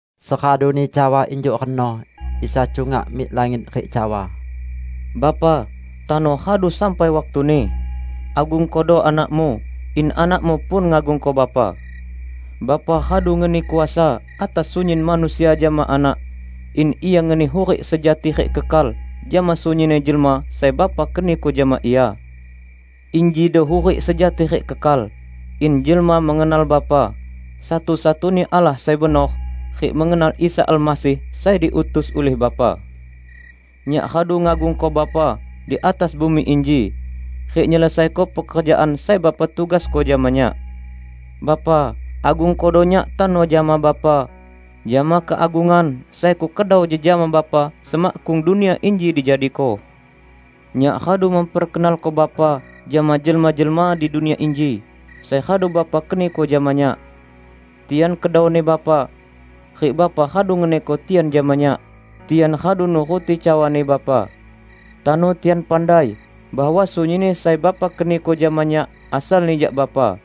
Seraduni cawa injuk reno, Isa cungak mik langit rik cawa, "Bapa, tano radu sampai waktuni. Agungkodo Anak-Mu, in Anak-Mu pun ngagungko Bapa. Bapa radu ngeni kuasa atas sunyin manusia jama Anak, in Ia ngeni hurik sejati rik kekal jama sunyinni jelma sai Bapa keniko jama Ia. Injido hurik sejati rik kekal; in jelma mengenal Bapa, satu-satuni Allah sai benor, rik mengenal Isa Almasih sai diutus ulih Bapa. Nyak radu ngagungko Bapa di atas bumi inji rik nyelesaiko pekerjaan sai Bapa tugasko jama Nyak. Bapa! Agungkodo Nyak tano jama Bapa, jama keagungan sai Kukedau jejama Bapa semakkung dunia inji dijadiko. Nyak radu memperkenalko Bapa jama jelma-jelma di dunia inji sai radu Bapa keniko jama Nyak. Tian kedauni Bapa, rik Bapa radu ngeniko tian jama Nyak. Tian radu nuruti cawani Bapa. Tano tian pandai bahwa sunyinni sai Bapa keniko jama Nyak asalni jak Bapa.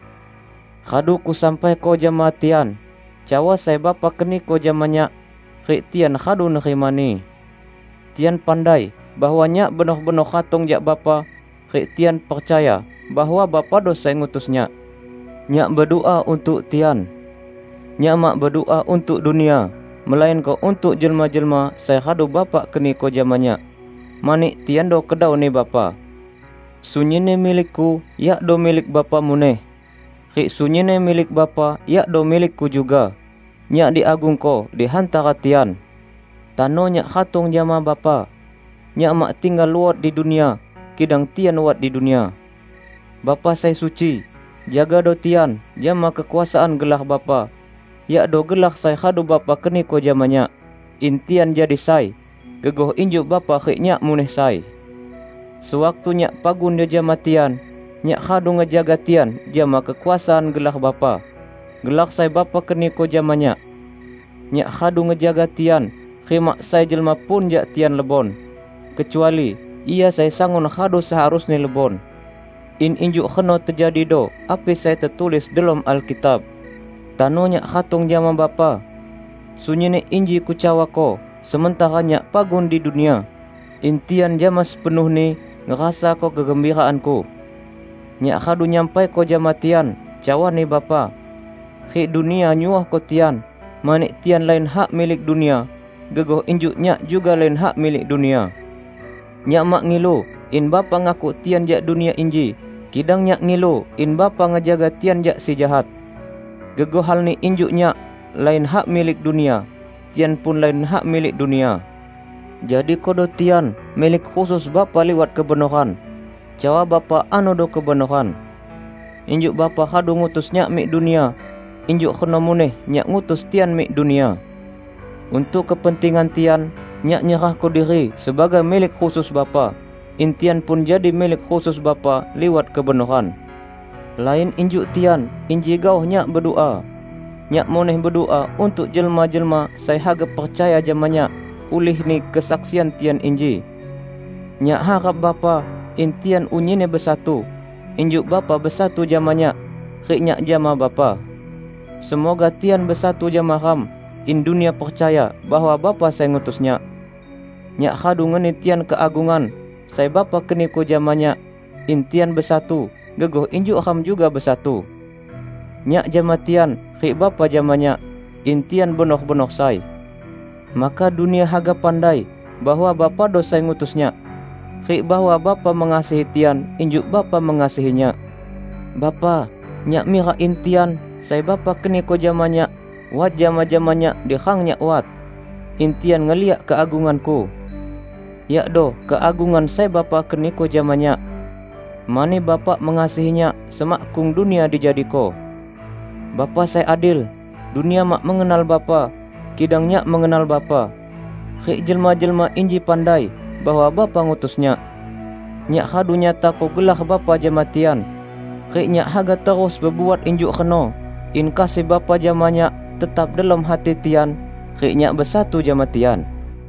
Radu Kusampaiko jama tian cawa sai Bapa keniko jama Nyak; rik tian radu nerimani. Tian pandai bahwa Nyak benor-benor ratong jak Bapa rik tian percaya bahwa Bapado sai ngutus Nyak. Nyak bedua untuk tian. Nyak mak bedua untuk dunia melainko untuk jelma-jelma sai radu Bapa keniko jama Nyak, mani tiando kedau-Ni Bapa. Sunyinni milik-Ku yakdo milik Bapa muneh, rik sunyinni milik Bapa yakdo milik-Ku juga. Nyak diagungko di hantara tian. Tano Nyak ratong jama Bapa. Nyak mak tinggal luot di dunia; kidang tian wat di dunia. Bapa sai suci! Jagado tian jama kekuasaan gelar Bapa, yakdo gelar sai radu Bapa keniko jama Nyak -- in tian jadi sai, gegoh injuk Bapa rik Nyak muneh sai. Sewaktu Nyak pagun jejama tian, Nyak radu ngejaga tian jama kekuasaan gelar Bapa -- gelar sai Bapa keniko jama Nyak. Nyak radu ngejaga tian rik mak sai jelma pun jak tian lebon, kecuali ia sai sangun radu seharusni lebon; in injuk reno tejadido api sai tetulis delom Alkitab. Tano Nyak ratong jama Bapa. Sunyinni inji Kucawako sementara Nyak pagun di dunia; in tian jama sepenuhni ngerasako kegembiraan-Ku. Nyak radu nyampaiko jama tian cawani Bapa, rik dunia nyuohko tian, mani tian lain hak milik dunia, gegoh injuk Nyak juga lain hak milik dunia. Nyak mak ngilu in Bapa ngakuk tian jak dunia inji, kidang Nyak ngilu in Bapa ngejaga tian jak si Jahat. Gegoh halni injuk Nyak lain hak milik dunia, tian pun lain hak milik dunia. Jadikodo tian milik khusus Bapa liwat kebenoran; cawa Bapa anodo kebenoran. Injuk Bapa radu ngutus Nyak mik dunia, injuk reno muneh Nyak ngutus tian mik dunia. Untuk kepentingan tian, Nyak nyerahko diri sebagai milik khusus Bapa, in tian pun jadi milik khusus Bapa liwat kebenoran. Lain injuk tian inji gaoh Nyak bedua. Nyak muneh bedua untuk jelma-jelma sai haga percaya jama Nyak ulihni kesaksian tian inji. Nyak harap, Bapa, in tian unyinni besatu, injuk Bapa besatu jama Nyak, rik Nyak jama Bapa. Semoga tian besatu jama Ram in dunia percaya bahwa Bapa sai ngutus Nyak. Nyak radu ngeni tian keagungan sai Bapa keniko jama Nyak, in tian besatu, gegoh injuk Ram juga besatu; Nyak jama tian, rik Bapa jama Nyak; in tian benor-benor sai. Maka dunia haga pandai bahwa Bapado sai ngutus Nyak, rik bahwa Bapa mengasihi tian injuk Bapa mengasihi Nyak. Bapa, Nyak mirak in tian, sai Bapa keniko jama Nyak, wat jama-jama Nyak di rang Nyak wat, in tian ngeliak keagungan-Ku; yakdo keagungan sai Bapa keniko jama Nyak, mani Bapa mengasihi Nyak semakkung dunia dijadiko. Bapa sai adil! Dunia mak mengenal Bapa, kidang Nyak mengenal Bapa; rik jelma-jelma inji pandai bahwa Bapa ngutus Nyak. Nyak radu nyatako gelar Bapa jama tian; rik Nyak haga terus bebuat injuk reno, in kasih Bapa jama Nyak tetap delom hati tian rik Nyak besatu jama tian."